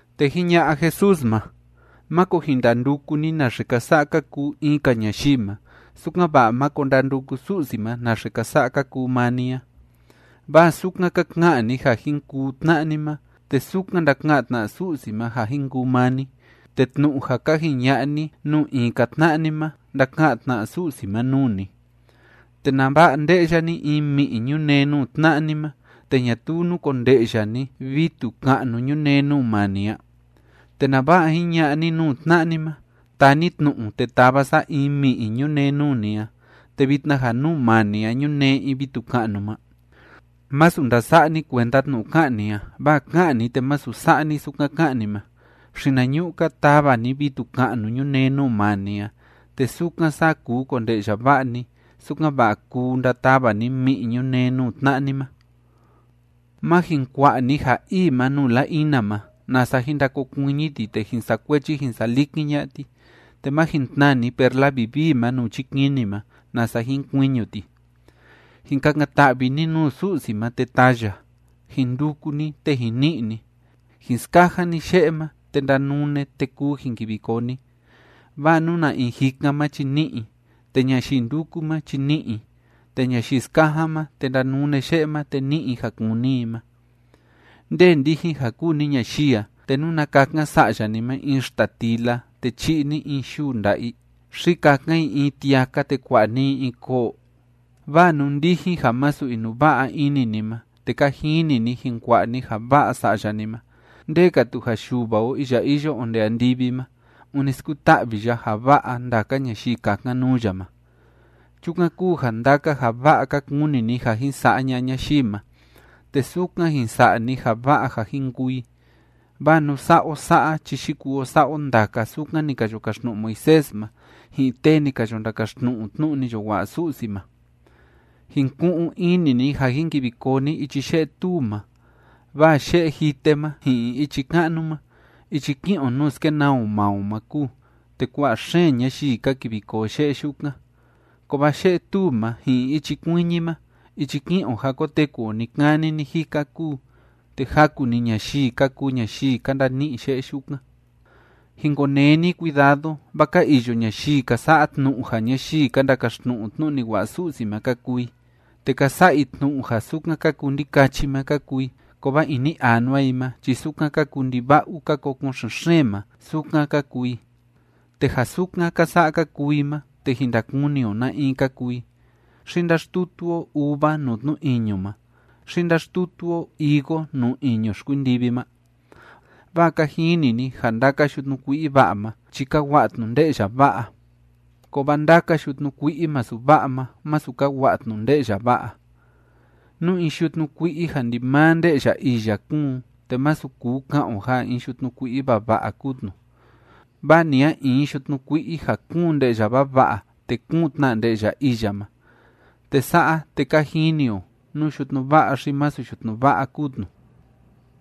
Te jiña'a Jesús ma: ―Máko jin ndanduku ni naxe ka sa'a ka kuu in‑ka ñayii ma, sukan‑va'a máko ndanduku Su'si ma naxe ka sa'a ka kuu maa ni a. Vaa sukan ka ka'an ni ja jin kuu tna'a ni ma, te sukan ndaka'an tna Su'si ma ja jin kuu maa ni, te tnu'u ja ka jiña'a ni nuu in‑ka tna'a ni ma ndaka'an tna Su'si ma nuu ni. ¿Te nava'a nde'ya ni in mi'i ñunee nuu tna'a ni ma, te ñatuu núkonde'ya ni vitu ka'nu ñunee nuu maa ni a? ¿Te nava'a jiña'a ni nuu tna'a ni ma: “Taa ni tnu'u, te tava sa in mi'i ñunee nuu ni a”, te vitna ja nuu maa ni a ñunee in vitu ka'nu ma? Masu ndasa'a ni kuenda tnu'u ká'an ni a, vaa ká'an ni te masu sa'a ni sukan ká'an ni ma. Xinañu'u‑ka tava ni vitu ka'nu ñunee nuu maa ni a, te sukan saa kuu konde'ya va'a ni, sukan‑va'a kuu ndatava ni mi'i ñunee nuu tna'a ni ma. ’Má jin kua'a ni ja ii ma nuu la‑ina ma, nasa jin ndakokuiñi ti te jin sa'a kuechi jin sa'a likin ña'a ti. Te má jin tnaa ni perla vivii ma nuu chikini ma, nasa jin kuiñu ti. ’Jin kakan‑ta'vi ni nuu Su'si ma, te taa ya. Jin nduku ni, te jin ni'i ni. Jin skajan ni ye'e ma, te ndanune, te kuu jin kivi koo ni. Vaa nú na in jikan ma chi ni'i i. Te ñayii ndúku ma chi ni'i i. Te ñayii skajan ma, te ndanune ye'e ma, te ni'i i ja kúni i ma. ’¿Nde ndijin ja kúu ni ñayii a, te nuna kakan sa'ya ni ma in xtatila, te chi'i ni in yuu nda'a i? ¿Xi kakan i in tiaka, te kua'a ni i in koo? Vaa nú ndijin ja masu inuva'a ini ni ma, te ka jini ni jin kua'a ni ja va'a sa'ya ni ma, ¡nde‑ka tu ja Yuva o iya iyo onde andivi ma, ûni skuta'vi ya ja va'a ndaka ñayii kakan nuu ya ma! ’Chukan kúu ja ndaka ja va'a ka kuni ni ja jin sa'a ña'a ñayii ma, te sukan jin sa'a ni ja va'a ja jin kuu i, vaa nú sa'a o sa'a chi yikuu o sa'a o ndaka sukan ni ka yo kaxtnu'u Moisés ma ji'in tee ni ka yo ndakaxtnu'u tnu'u ni yo wa'a Su'si ma. ’Jin ku'un ini ni ja jin kivi koo ni ichi ye'e tuu ma, vaa ye'e jite ma ji'in ichi ka'nu ma, ichi ki'in o nuu skenaa o maa o ma kúu, te kua'a xeen ñayii ka kivi koo ye'e yukan. Kovaa ye'e tuu ma ji'in ichi kuiñi ma ichi ki'in o ja koteku o ni‑kani ni‑jika kúu, te jaku‑ni ñayii ka kuu ñayii ka ndani'i ye'e yukan. ’Jin konee ni cuidado, vaa ka iyo ñayii ka sa'a tnu'u ja ñayii ka ndakaxtnu'u tnu'u ni wa'a Su'si ma ka kuu i, te ka sa'a i tnu'u ja sukan ka kuu ndikachi ma ka kuu i, kovaa ini anua i ma chi sukan ka kuu ndiva'u ka kokon xen‑xeen ma, sukan ka kuu i. Te ja sukan ka sa'a ka kuu i ma, te jin ndakuni o na in ka kuu i. ¿Xi ndáxtutu o uva nuu tnu iñu ma, xi ndáxtutu o higo nuu iñu xkuindivi ma? Vaa ka jini ni ja ndaka yutnu kui'i va'a ma chi ka wa'a tnu nde'ya va'a, kovaa ndaka yutnu kui'i masu va'a ma, masu ka wa'a tnu nde'ya va'a. Nú in yutnu kui'i ja ndimaa nde'ya iya kúun, te masu kuu ka'an o ja in yutnu kui'i vava'a kúu tnu. Vaa ni a in yutnu kui'i ja kúun nde'ya vava'a, te kúun tna nde'ya iya ma. Te sa'a, te ka jini o nú yutnu va'a xi masu yutnu va'a kúu tnu.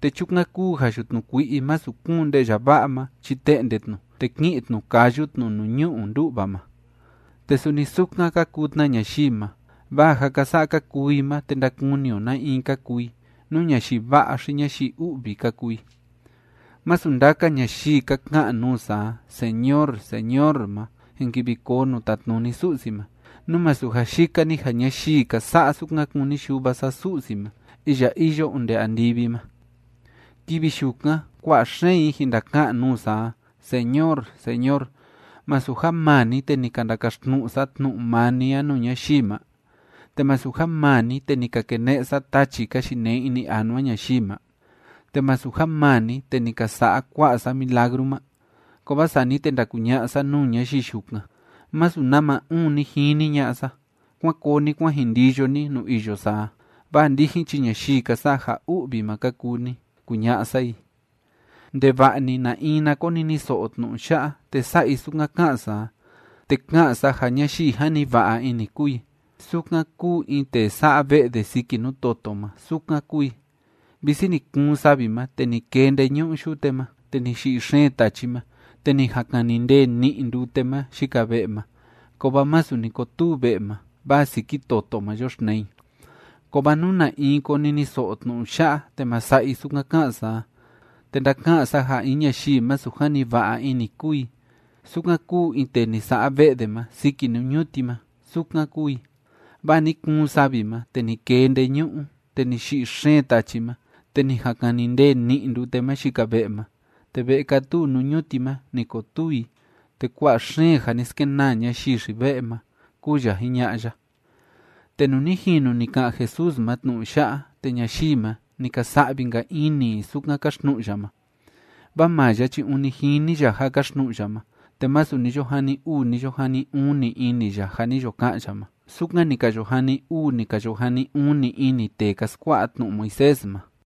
Te chukan kúu ja yutnu kui'i masu kúun nde'ya va'a ma chi te'nde tnu, te ki'in tnu kayu tnu nuu ñu'u ndú'va ma. Te suni sukan ka kuu tna ñayii ma. Vaa ja ka sa'a ka kuu i ma, te ndakuni o na in ka kuu i, nú ñayii va'a xi ñayii u'vi ka kuu i. ’Masu ndaka ñayii ka ka'an nuu sa a: “Señor, Señor” ma, jin kivi koo nuu tatnuni Su'si ma, nú masu ja yika‑ni ja ñayii ka sa'a sukan kúni Yuva sa Su'si ma iya iyo onde andivi ma. Kivi yukan kua'a xeen i jin ndaka'an nuu sa a: “Señor, Señor, ¿masu ja maa ni, te ni ka ndakaxtnu'u sa tnu'u maa ni a nuu ñayii ma? ¿Te masu ja maa ni, te ni ka kene'e sa tachi ka yinee ini anua ñayii ma? ¿Te masu ja maa ni, te ni ka sa'a kua'a sa milagru ma?” Kovaa sani te ndakuña'a sa nuu ñayii yukan: “Masu nama uun ni jini ña'a sa. ¡Kuán koo ni kuán jin ndiyo ni nuu iyo sa a! ¡Vaa ndijin chi ñayii ka sa'a ja u'vi ma ka kuu ni!”, kuña'a sa i. ’Ndeva'a‑ni na in na koniniso'o tnu'u ya'a te sa'a i sukan ká'an sa a, te ká'an sa ja ñayii jani va'a ini kúu i, sukan kúu in tee sa'a ve'e de siki nuu toto ma, sukan kúu i. Visi ni kuun savi ma te ni kee ndeñu'u yute ma, te ni yi'i xeen tachi ma, te ni jan kani ndee ni'i ndute ma yika ve'e ma, kovaa masu ni kotuu ve'e ma, vaa siki toto ma yoxtnee i. Kovaa nú na in koniniso'o tnu'u ya'a te ma sa'a i sukan ká'an sa a, te ndaka'an sa ja in ñayii masu jani va'a ini kúu i, sukan kúu in tee ni sa'a ve'e de ma siki nuu ñuti ma, sukan kúu i. Vaa ni kuun savi ma, te ni kee ndeñu'u, te ni yi'i xeen tachi ma, te ni jan kani ndee ni'i ndute ma yika ve'e ma, te ve'e kátuu nuu ñuti ma, ni kotuu i, te kua'a xeen ja ni skenaa ñayii xi‑ve'e ma ―kúu ya jiña'a ya. Te nuu ni jinu ni ka'an Jesús ma tnu'u ya'a, te ñayii ma, ni ka sa'vi‑nka ini i sukan káxtnu'u ya ma. Vaa maa ya chi ûni jini ya ja káxtnu'u ya ma, te masu ni yo jani uu ni yo jani uni ini ya ja ni yo ka'an ya ma, sukan ni ka yo jani uu ni ka yo jani uni ini tee ka skua'a tnu'u Moisés ma.